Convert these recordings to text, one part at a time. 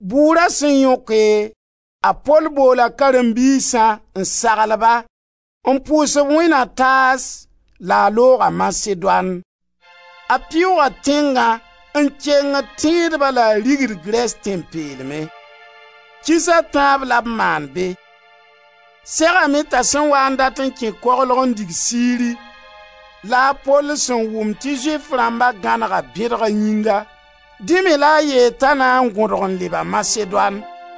Bʋʋra sẽn yõke, a Pol boola karen-biisã, n sagl-ba, n pʋʋs-b wẽnd na taas la a looga Masedoan. A Pɩʋʋga tẽngã n kengd tẽedbã la a rigd Grɛs Tẽn-peelmẽ. Kiis a tãab la b maan be. Segame t'a sẽn waa n dat n kẽ koglg n dig Siri la a Pol sẽn wʋm tɩ Zʋɩf rãmba gãnega bẽdg a yĩnga. Dẽ me la a yeel t'a na n gõdg n leba Masedoan.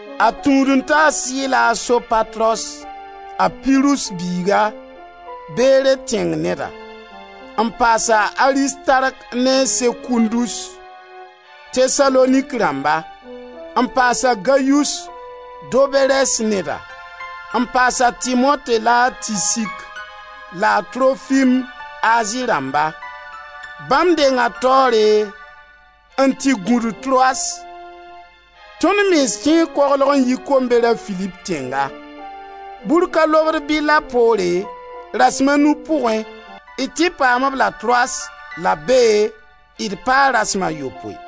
A tũud-n-taas yi-la a Sopatros, a Pirus biiga, Bere tẽng neda; n paas a Aristark ne a Sekundus, Tesalonik rãmba; n paas a Gayus, Doberɛs neda, n paas a Timote la a Tisik, la a Trofim, Azi rãmba. Bãmb denga taoore n tɩ gũ-d Troas. Tõnd mens kẽe koglg n yi komber a Filip tẽnga. Bur ka lobd bɩlla poore, rasem a nu pʋgẽ, d tɩ paam-b la Troas la bee d paa rasem a yopoe.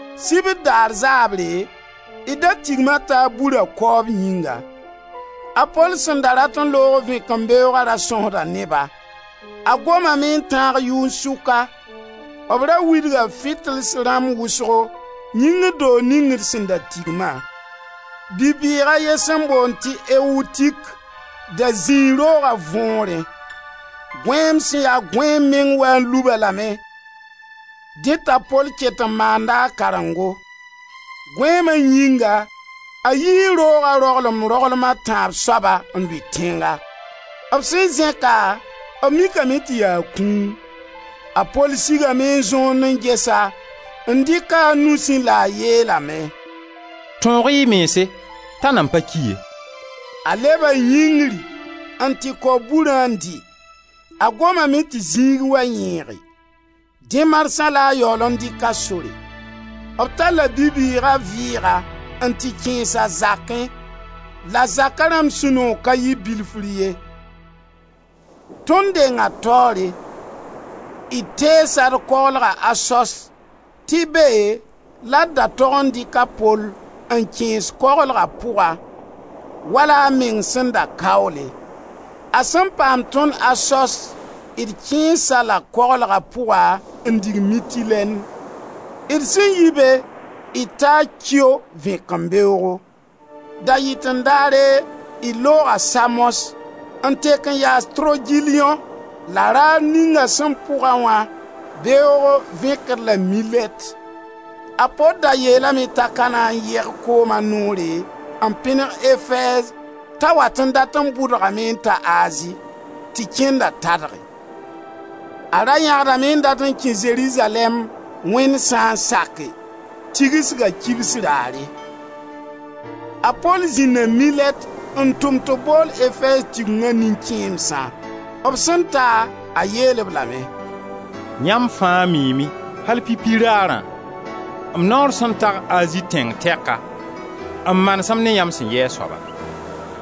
Sibr daar zaabre, d da tigma taab bura kaoob yĩnga. A Pol sẽn da rat n loog vẽkẽmbeooga ra sõsda ne-ba. A gomame n tãag yʋn-sʋka. B ra widga fitils rãmb wʋsgo yĩngr doog ning d sẽn da tigma. Bi-bɩɩg a ye sẽn boond tɩ Eutik da zĩi rooga võorẽ. Gõeem sẽn ya gõeem meng wa n lub-a lame, dẽ t'a Pol ket n maanda a karengo. Gõeema yĩnga a yii rooga roglem-roglem a tãab soaba n lʋɩ tẽnga. B sẽn zẽk-a, b mikame tɩ yaa kũum. A Pol sigame n zõond n ges-a, n dɩk-a a nusẽ la a yeelame: «Tõog-y y mense t'a nan pa ki ye.» A leba yĩngri n tɩ kao burã n dɩ; a Gomame tɩ zĩig wa yẽege. Dẽ marsã la a yaool n dɩk a sore. B talla bi-bɩɩga vɩɩga n tɩ kẽes a zakẽ la zaka rãmb sũ-noog ka yɩ bilfr ye. Tõnd denga taoore. D teesa d koglga Asos tɩ be la d da tog n dɩk a Pol n kẽes koglga pʋga wala a meng sẽn da kaoole. A sẽn paam tõnd Asos d kẽes-a la koglga pʋga n dig Mitilɛn. D sẽn yi be d taa Kio vẽkembeoogo. Da-yɩten-daare d looga Samos n tek n yaas Trogiliõ la raar ninga sẽn pʋga wã beoog vẽk-d la Milɛt. A Pol da yeelame t'a ka na n yeg kooma noore n pẽneg Efɛɛz t'a wat n dat n bʋdgame n ta Azi, tɩ kẽnda tadge. A ra yãgdame n dat n kẽ Zerizalɛɛm, Wẽnd sã n sake, Tigsga kibs raare. A Pol zĩnda Milɛt n tʋm tɩ b bool Efɛɛz Tigenga nin-kẽemsã. B sẽn ta, a yeel-b lame: «Yãmb fãa miime, al pipi raarã, m naoor sẽn tag Azi tẽng tɛka, m manesem ne yãmb sẽn yɩ a soaba.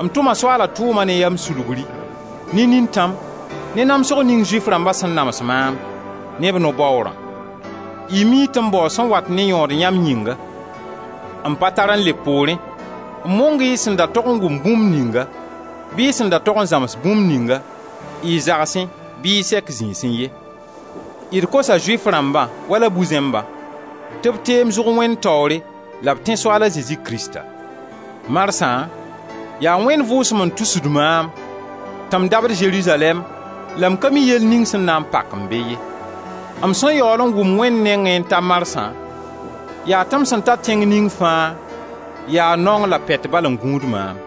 M tʋma Soaala tʋʋma ne yam sulgri, ne nintãm, ne namsg ning Zʋɩf rãmba sẽn nams maam ne b no-baoorã. Y mii tɩ m baoo sẽn wat ne yõod yãmb yĩnga. M pa tar n leb poorẽ n mong-y y sẽn da tog n wʋmb bũmb ninga bɩ y sẽn da tog n zãms bũmb ninga, y zagsẽ bɩ y sɛk zĩisẽ ye. D kosa Zʋɩf rãmbã wala bu-zẽmbã, tɩ b teem zʋg Wẽnd taoore la b tẽ Soaal a Zezi Krista. Marsã yaa Wẽnd Vʋʋsem n tusd maam tɩ m dabd Zerizalɛɛm la m ka mi yell ning sẽn na n pak-m be ye. M sẽn yaool n wʋm Wẽnd nengẽ n ta marsã yaa tɩ m sẽn ta tẽng ning fãa yaa naong la pɛt bal n gũud maam.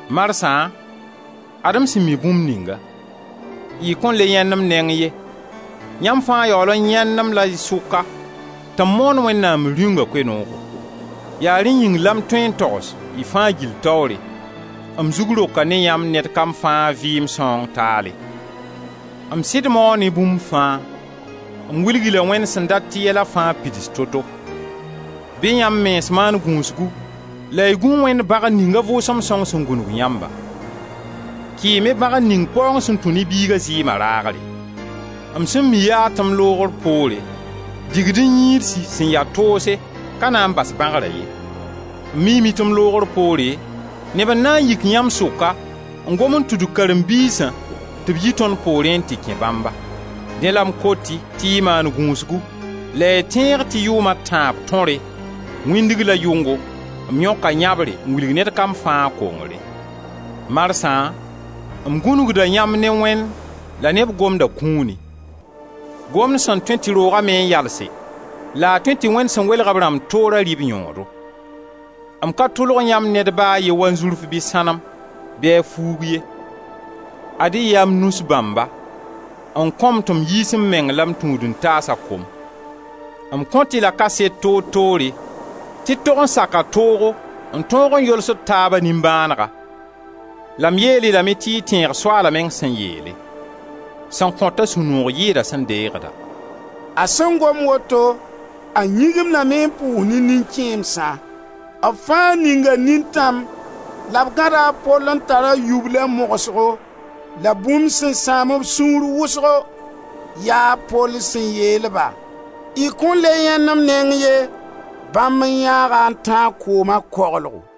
Marsã, ad-m sẽn mi bũmb ninga: y kõn le yãend m neng ye; yãmb fãa yaool n yãend-m la y sʋka tɩ m moond Wẽnnaam Rĩunga Koe-noogo. Yaa rẽ yĩng la m tõe n togs, y fãa gill taoore: m zug roka ne yãmb ned kam fãa vɩɩm sãoong taale. M sɩd mao ne bũmb fãa; m wilg-y-la Wẽnd sẽn dat tɩ yɛla fãa pids to-to. Bɩ yãmb mens maan gũusgu la y gũ Wẽnd bãgr ning a Vʋʋsem Sõng sẽn gũnug yãmbã. Kɩɩm-y bãgr ning paoong sẽn tũ ne Biiga zɩɩma raagre. M sẽn mi yaa tɩ m loogra poore digd-n-yĩidsi sẽn ya toose, ka na n bas bãgra ye. M miime tɩ m loogr poore, neb n na n yik yãmb sʋka, n gom n tudug karen-biisã tɩ b yi tõnd poorẽ n tɩ kẽ bãmba. Dẽ la m kot-y tɩ y maan gũusgu la y tẽeg tɩ yʋʋm a tãab tõre, wĩndg la yʋngo m yõka yãbre n wilg ned kam fãa a kongre. Marsã m gũnugda yãmb ne Wẽnd la ne b Gomda kũuni: Gomd sẽn tõe tɩ rooga me n yalse, la a tõe tɩ Wẽnd sẽn welg b rãmb toora rɩ b yõodo. M ka tʋlg yãmb ned ba a ye wanzurf bɩ a sãnem, bɩ a fuug ye. Ad-y yaa m nus bãmba m kõ-m tɩ m yiis m meng la m tũud-n-taasa kom. M kõ-y la kaset toor-toore, tɩ d tog n saka toogo n tõog n yols d taaba nimbãanega la m yeel-y lame tɩ y tẽeg Soaala meng sẽn yeele: sẽn kõt-a sũ-noog yɩɩda sẽn deegd-a.» A sẽn gom woto, a yĩgimdame n pʋʋs ne nin-kẽemsã. B fãa ninga nintãm la b gãda a Pol n tara yubla mogsgo. La bũmb sẽn sãam b sũur wʋsgo, yaa Pol sẽn yeel-ba: y kõn le yãend m neng ye. Bãmb n yãag-a n tãag kooma koglgo.